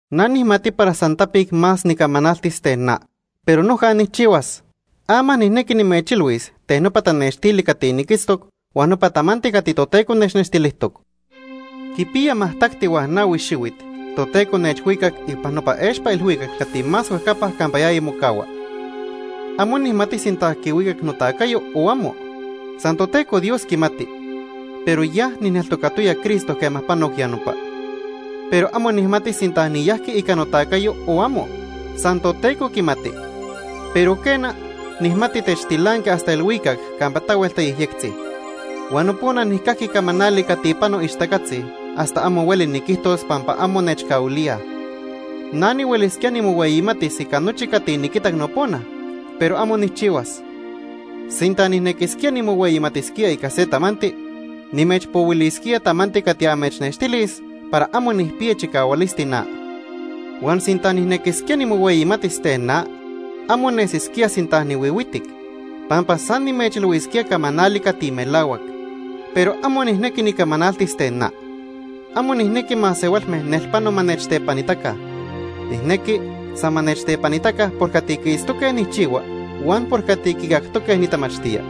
Na nijmati para san tapic más nicamanaltis ten na, pero noja nijchihuas. Ama nijnequi nimechilhuis ten nopa tanextili cati niquitztoc huan nopa tamanti cati Toteco nechnextilijtoc. Quipiya majtacti huan nahui xihuit Toteco nechhuicac ipan nopa expa ilhuicac cati más huejcapa campa yaya mocahua. Amo nijmati sinta quihuicac notacayo o amo, san Toteco Dios quimati, pero ya nijneltocayaya Cristo quema panoc ya nopa. Pero amo nijmati sinta niyajqui ica notacayo o amo. San Toteco quimati. Pero, quena, nijmati nechtilanqui hasta ilhuicac campa tahuel tayejyectzi. Huan nopona nijcajqui camanali cati pano ixtacatzi hasta amo hueli niquijtos pampa amo nechcahuilíaj. Na nihuelisquía nimohueyimatis ica nochi cati niquitac nopona, pero amo nijchihuas. Sinta nijnequisquía nimohueyimatisquía ica se tamanti, nimechpohuilisquía tamanti cati amechnextilis para amo nijpiya chicahualisti na. Huan sinta nijnequisquía nimohueyimatis ten na, amo nesisquía sinta huihuitic, pampa san nimechilhuisquía camanali cati melahuac. Pero amo nijnequi nicamanaltis ten na. Amo nijnequi masehualme nelpano ma nechtepanitaca. Nijnequi san ma nechtepanitaca por cati quiitztoque nijchihua huan por cati quicactoque nitamachtía.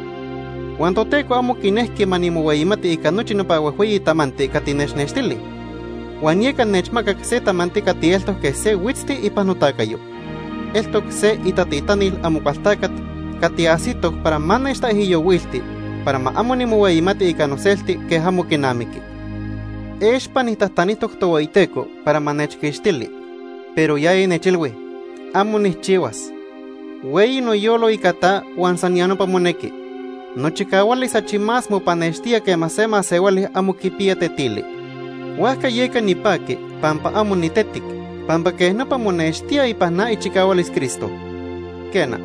Huan Toteco amo quinejqui ma nimohueyimati ica nochi nopa huejhueyi tamanti cati nechnextili, huan yeca nechmacac se tamanti cati eltoc quej se huitzti ipan notacayo. Eltoc se itatitanil Amocualtacat cati ajsitoc para ma nechtaijyohuilti para ma amo nimohueyimati ica noselti quej amo quinamiqui. Expa nijtajtanijtoc Tohueyiteco para ma nechquixtili, pero yaya nechilhui: “¡Amo nijchihuas! Hueyi noyolo ica ta huan san ya nopa monequi. Nochicahualis achi más mopanextía quema se masehuali amo quipiya tetili.” Huajca yeca nipaqui pampa amo nitetic, pampa quej nopa monextía ipan na ichicahualis Cristo. Quena,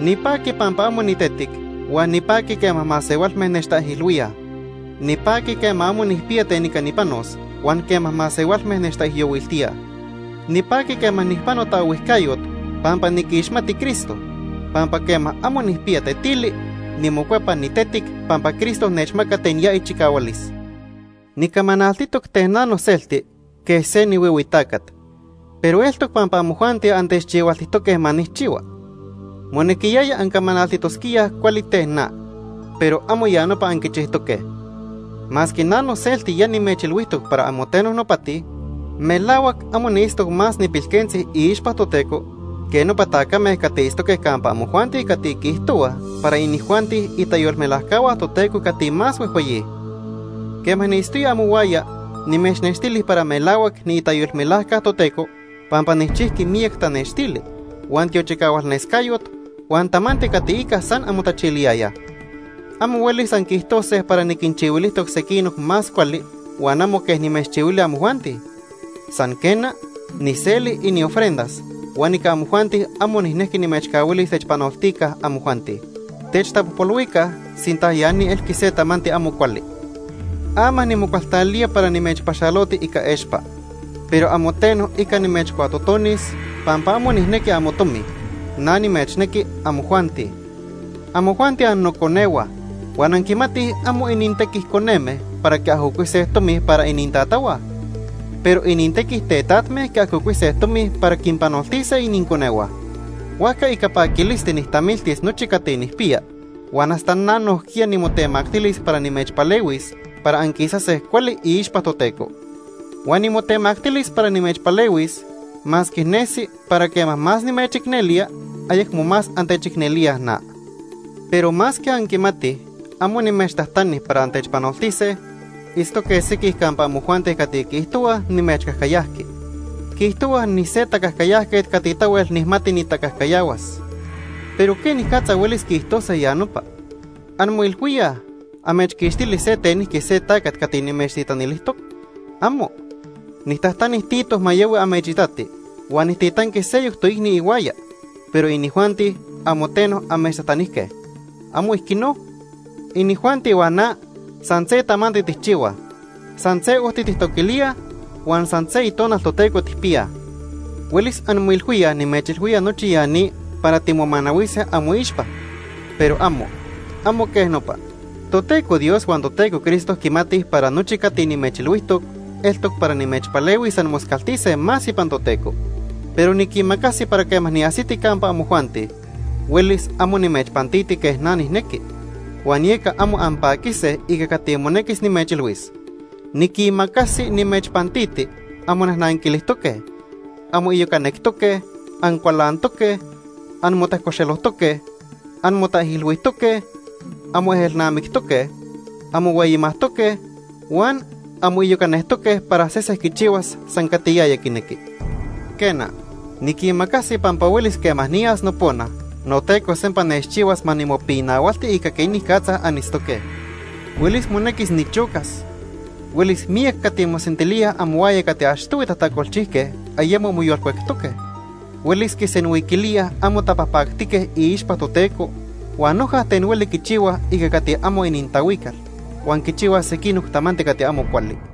nipaqui pampa amo nitetic huan nipaqui quema masehualme nechtaijilhuíaj. Nipaqui quema amo nijpiya ten ica nipanos huan quema masehualme nechtaijyohuiltíaj. Nipaqui quema nijpano taohuijcayot pampa niquixmati Cristo, pampa quema amo nijpiya tetili, nimocuepa nitetic pampa Cristo nechmaca ten ya ichicahualis. Nicamanaltitoc ten na noselti quej se nihuihui tacat. Pero eltoc pampa amojuanti antechchihualtijtoque ma nijchihua. Monequiyaya ancamanaltitosquíaj cuali ten na, pero amo ya nopa anquichijtoque. Masque na noselti ya nimechilhuijtoc para amo teno nopati, melahuac amo niitztoc más nipilquentzi iixpa Toteco que nopa tacame cati itztoque campa amojuanti cati quiijtohuaj para inijuanti itayolmelajcahua Toteco cati más huejhueyi. Quema niitztoya amohuaya nimechnextili para melahuac niitayolmelajca Toteco pampa nijchijqui miyac tanextili, huan tiochicahualnescayot, huan tamanti cati ica san anmotachiliyayaj. Amo huelis anquiijtose para niquinchihuilijtoc sequinoc más cuali huan amo quej nimechchihuili amojuanti. San, quena, nijseli iniofrendas huan ica amojuanti amo nijnejqui nimechcahuilis techpanoltica amojuanti. Techtapojpolhuica sinta ya ni elqui se tamanti amo cuali. Ama nimocualtalía para nimechpaxaloti ica expa. Pero amo teno ica nimechcuatotonis pampa amo nijnequi amotomi, na nimechnequi amojuanti. Amojuanti annoconehua huan anquimatij amo inintequi coneme para quiajocuise tomi para inintatahua, pero inintequi tetatme quiajocuise tomi para quinpanoltise ininconehua. Huajca ica paquilisti nijtamiltis nochi cati nijpiya huan hasta na nojquiya nimotemactilis para nimechpalehuis para anquisase cuali iixpa Toteco. Huan nimotemactilis para nimechpalehuis masque nesi para quema más nimechicnelía, ayecmo más antechicnelíaj na. Pero masque anquimatij amo nimechtajtani para antechpanoltise, itztoque sequij campa amojuanti cati quiijtohuaj nimechcajcayajqui. Quiijtohuaj nise tacajcayajquet cati tahuel nijmati nitacajcayahuas. Pero ¿quenicatza huelis quiijtose ya nopa? ¿Anmoilhuíaj amechquixtili se tenijqui se tacat cati nimechtitanilijtoc? ¡Amo! Nijtajtani Tito ma yahui amechitati huan nijtitanqui seyoc toicni ihuaya, pero inijuanti amo teno amechtajtanijque. ¿Amo ijquino? Inijuanti huan na san se tamanti tijchihuaj. San se ojti tijtoquilíaj huan san se Itonal Toteco tijpiyaj. Huelis anmoilhuíaj nimechilhuía nochi ya ni para timomanahuise amoixpa, pero amo, amo quej nopa. Toteco Dios huan Toteco Cristo quimatij para nochi cati nimechilhuijtoc eltoc para nimechpalehuis anmoscaltise más ipan Toteco. Pero niquimacasi para quema niajsiti campa amojuanti, huelis amo nimechpantiti quej na nijnequi, huan yeca amo anpaquise ica cati monequis nimechilhuis. Niquimacasi nimechpantiti anmonajnanquilijtoque, anmoiyocanectoque, ancualantoque, anmotajcoxelojtoque, anmotaijilhuijtoque, anmoejelnamictoque, anmohueyimajtoque huan anmoiyocacajtoque para sese quichihuas san cati yaya quinequi. Quena, niquimacasi pampa huelis quema niyas nopona, noTeco sempa nechchihuas ma nimopinahualti ica quenicatza anitztoque. Huelis monequis nichocas. Huelis miyac cati mosentilíaj amohuaya cati achtohui tajtacolchijque ayemo moyolcuectoque. Huelis quisenhuiquilíaj amo tapajpactique iixpa Toteco, huan noja ten hueli quichihuaj ica cati amo inintahuical, huan quichihuaj sequinoc tamanti cati amo cuali.